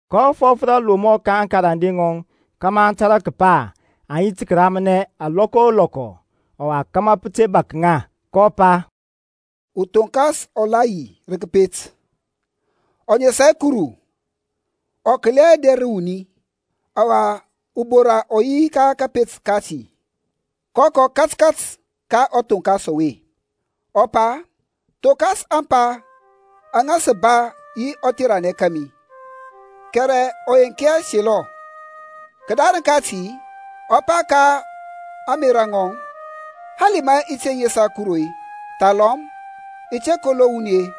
kɔ fɔf rə alomɔ ka aŋkarande ŋɔŋ kȧmȧ aŋ tȧrȧ kəpa aŋ yi tə kəramnɛ lɔkɔ o lɔkɔ, ɔwa kȧmȧ pə te bȧk ŋa. kɔ pa, Uthoŋkas ɔ la yi rə kəpet, ɔ nesa hɛ Kuru, ɔ kəli hɛ ader ra wuni. Ɔwa ubora ɔ yi ka kȧpet kati, kɔ kɔ kȧtkȧt ka ɔthonkas ɔwe, ɔ pa, Thonkas ȧŋpa aŋa sə ba yi ɔtheranɛ kȧmi. Kɛrɛ ɔ yenk hɛ selɔ. Kədarəŋ kati ɔ pa ka ȧŋmerȧ ŋɔŋ, Hali ma i te nesa Kuru-e, thalɔm i te kolo wuni-e,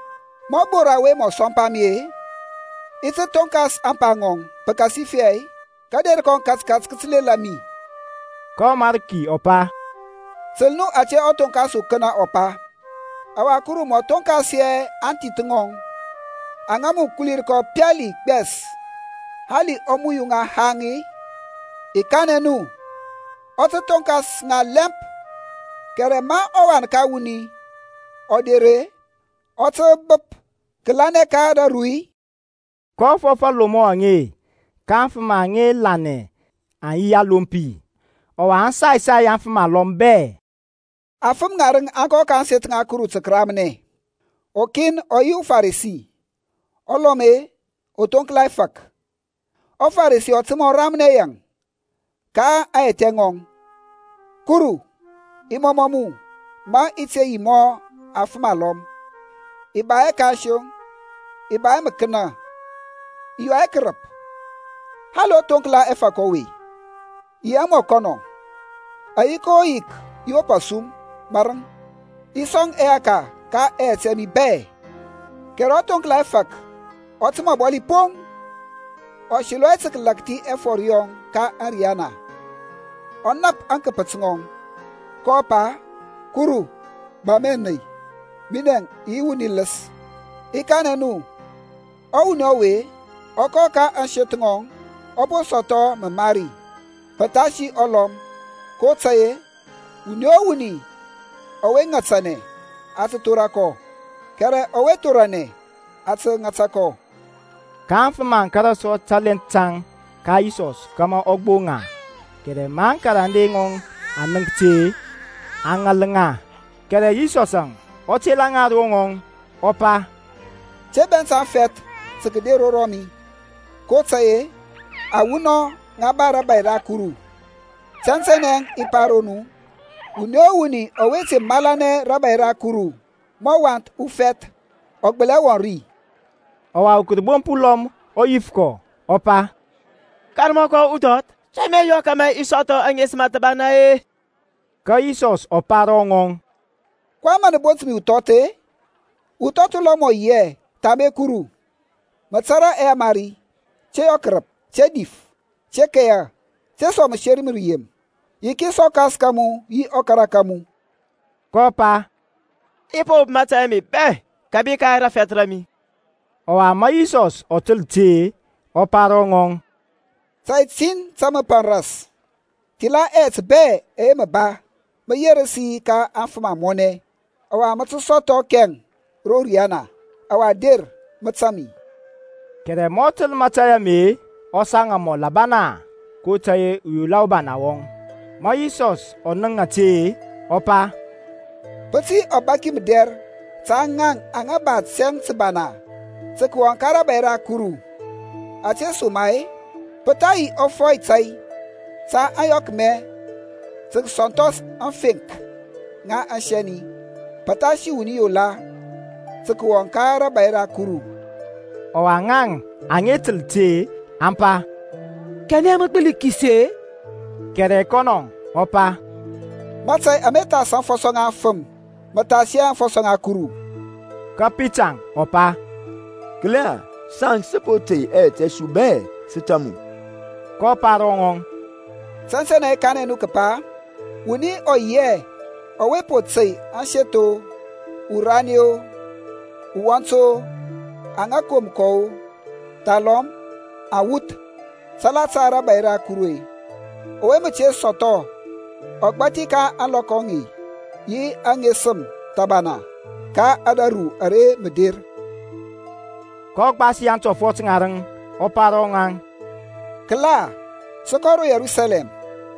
ma ɔbora ɔwe ɔ sɔmpa mi-e, i ti thonkas ȧŋpa ŋɔŋ, pəkasifɛ kȧder kɔŋ katkat kə tə lela mi. Ka ɔMarki ɔ pa, Təl nu ȧte ɔthoŋkas ukənə ɔ pa. Ɔwa Kuru mɔ thonkas hɛ aŋthith ŋɔŋ aŋa mə kulir kɔ pali gbɛs hali ɔ muyu ŋa haŋ-i? I kanɛ nu ɔ tə thonkas ŋa lɛmp. Kɛrɛ ma ɔWan ka wuni ɔ der-e, ɔ tə bəp kəlanɛ ka raru-i? kɔ fɔf aŋlomɔ aŋe ka aŋfəm aŋa lanɛ aŋ yi alompi, ɔwa aŋ sai sai afəm alɔm bɛ. Afəm ŋarəŋ aŋ kɔ ka ȧŋseth ŋa Kuru tə kəramnɛ. Ukin ɔ yi uFarisi, ɔlɔm-e, uthoŋkla ɛfȧk. ƆFaresi ɔ təmȧ ɔ ramnɛ yaŋ ka aŋyɛthɛ ŋɔŋ, Kuru i mɔmɔ mu ma i te yi mɔ afəm alɔm, i ba hɛ kansoŋ, i ba hɛ məkənə, i yɔ hɛ kərəp, hali ɔthoŋkla ɛfȧk ɔwe-e, i yi hɛ mɔ kɔnɔ. Ayik o yik i wop asum mȧrəŋ, i sɔŋ ɛyaka ka ɛyɛt mi bɛ. Kɛrɛ ɔthoŋkla ɛfȧk ɔ təmȧ ɔbɔli poŋ, ɔ selɔ hɛ tə kəlȧkthi ɛfɔr yɔŋ ka ȧriyana, ɔ nap aŋkəpət ŋɔŋ, kɔ pa, Kuru ba mi ȧney, minɛ i yi wuni ləs. I kanɛ nu ɔwuni ɔwe ɔ kɔ ka ȧŋseth ŋɔŋ, ɔ po sɔthɔ məmari pəthasi ɔlɔm; kotȧy-e wuni o wuni ɔwe ŋatanɛ a tə thora kɔ, kɛrɛ ɔwe thoranɛ, a tə ŋata kɔ. Ka aŋfəm aŋ kȧrȧ sɔ talɛnth taŋ ka Yisɔs kȧmȧ ɔ gboŋ ŋa, kɛrɛ ma aŋkarande ŋɔŋ aŋ nənk ti-e, aŋ ŋal ŋa. Kɛrɛ Yisɔsȧŋ ɔ tela ŋa ro ŋɔŋ, ɔ pa, Te bɛnt aŋfɛth tɔ kəder ro mi, kotȧy-e awunɔŋ ŋa ba rȧbȧy ra Kuru. Tɛntɛnɛ i pa ro nu, wuni o wuni ɔwe te malanɛ rȧbȧy ra Kuru mɔ wath ufɛth ɔ gbəli hɛ wɔŋ ri. Ɔwa urəbomp ulɔm ɔ yif kɔ, ɔ pa, Karmɔkɔ uthɔth, to mə i yɔ kȧmȧ i sɔthɔ aŋesəm thəbana-e? Ka Yisɔs ɔ pa ro ŋɔŋ, kɔyɛŋ mȧ mə bont mi uthɔth-e? Uthɔth ulɔm ɔ yi hɛ thambe Kuru. Mə tata ɛyamari, Te yɔ kərəp, te dif, te keya, te sɔŋ məseri ma rəyem, yikis ɔkas ka mu yi ɔkara ka mu. kɔ pa, I po wop mȧtȧy ame bɛ kȧbi ka rafɛth ra mi. Ɔwa ma Yisɔs ɔ təl ti-e, ɔ pa ro ŋɔŋ, Tȧy tin tȧ mə paŋ ras; thila ɛyɛt bɛ ɛyɛ mə ba, mə yerəs yi ka aŋfəm amɔnɛ, ɔwa mə tə sɔthɔ kɛŋ ro riyana. Ɔwa der, mə tȧŋ mi. Kɛrɛ ma ɔ təl mȧtȧy ame-e, ɔ saŋ amɔl abana, kotȧy-e uyola ubana wɔŋ. Ma Yisɔs ɔ nənk ȧte-e, ɔ pa, Pə tə yi ɔbaki mədɛr ta ŋaŋ aŋa ba tɛŋ təbana tə kəwɔŋ ka rȧbȧy ra Kuru! Ȧtesoma-e pə tha yi ɔfɔy tȧy ta ȧyɔkmɛ tə kəsɔnthɔs aŋfeŋk ŋa asɛni, pəthasi wuni yola tə kəwɔŋ ka rȧbȧy ra Kuru. Ɔwa ŋaŋ aŋa təl ti aŋ pa, Kanɛ mən mə gbəli kisi-e? Kɛrɛ kɔnɔ ɔ pa, Mȧtȧy ama thas aŋfɔsɔ ŋa afəm mə thas hɛ aŋfɔsɔ ŋa Kuru. Ka Pita ɔ pa, Kəla, saŋ sə po tey ɛyɛt ɛ su bɛ, sə tȧŋ mu. kɔ pa ro ŋaŋ, Tɛntɛnɛ i kanɛ nu kəpa, wuni ɔ yi hɛ ɔwe po tey aseth-o, urani-o, uwɔnt-o, aŋa kom kɔ-o, thalɔm awuth salata rȧbȧy ra Kuru-e, ɔwe mə te sɔthɔ ɔgbȧthi ka ȧŋlɔkɔ aŋe yi aŋesəm thɔbana ka ȧdȧru ara mə der. kɔ gbasi aŋtɔfɔt ŋarəŋ, ɔ pa ro ŋaŋ, Kəla, sə kɔ ro Yerusalɛm,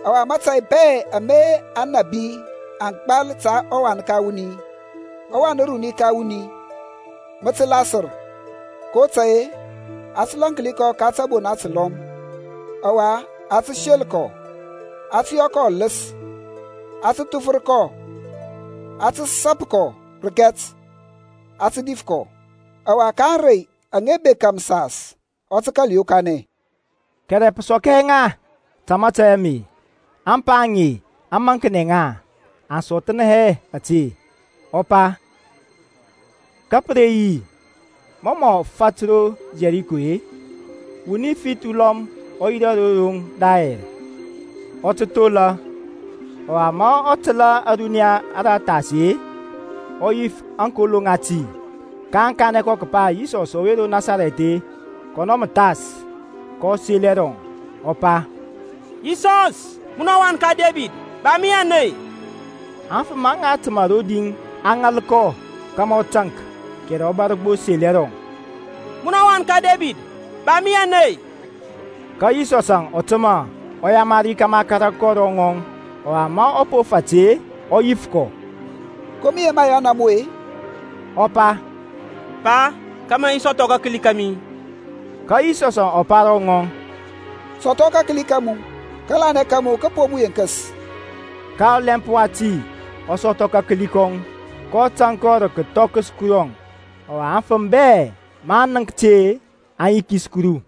ɔwa mȧtȧy bɛ ama aŋnabi aŋ gbal ta ɔWan uruni ka wuni mə tə lasər. kotȧy-e a tə lȧnki kɔ ka tȧbona təlɔm, ɔwa a tə sel kɔ, a tə yɔ kɔ ɔləs, a tə thufər kɔ, aŋ tə sȧpȧ kɔ rəkɛt, aŋ tə dif kɔ; ɔwa ka ȧŋrey aŋa bekȧ məsas ɔ tə kȧl yokanɛ. Kɛrɛ pə sɔk hɛ ŋa ta mȧtȧy ame; ȧŋpa aŋe aŋ maŋknɛ ŋa, aŋ sɔthnɛ hɛ ȧte ɔ pa. Ka pə re yi, mɔ mɔ fat ro Yɛriko-e, wuni fith ulɔm ɔ yirȧ ro roŋ rayɛr, ɔ tə thola. Ɔwa ma ɔ təlȧ ȧruniya ara thas-e, ɔ yif aŋkolo ŋati. kaŋ kanɛ kɔ kəpa Yisɔs ɔwe ro Nasarɛth-e, kɔnɔ mə thas. kɔ sel ɛrɔŋ, ɔ pa, Yisɔs, munɔ wan ka Debid, ba mi ȧney. Aŋfəm aŋa təmȧ rodi aŋ ŋal kɔ kȧmȧ ɔ taŋk, kɛrɛ ɔ bȧr gbo sel ɛrɔŋ, Munɔ wan ka Debid, ba mi ȧney. Ka Yisɔsȧŋ ɔ təmȧ, ɔ yamari kȧmȧ a kȧrȧ kɔ ro ŋɔŋ. Ɔwa ma ɔ po fat-e, ɔ yif kɔ, Ko mə yema i yɔna mu-e? Ɔ pa, Pa, kȧmȧ i sɔthɔ kakəli kȧmi. Ka Yisɔsȧŋ ɔ pa ro ŋɔŋ, Sɔthɔ kakəli ka mu. Kȧlanɛ ka mu kə po mu yenkəs. Ka ɔlɛmp wati ɔ sɔthɔ kakəli kɔŋ, kɔ tȧŋ kɔ rə kəthɔkəs Kurɔŋ; ɔwa aŋfəm bɛ maŋ nənk ti-e, aŋ yikis Kuru.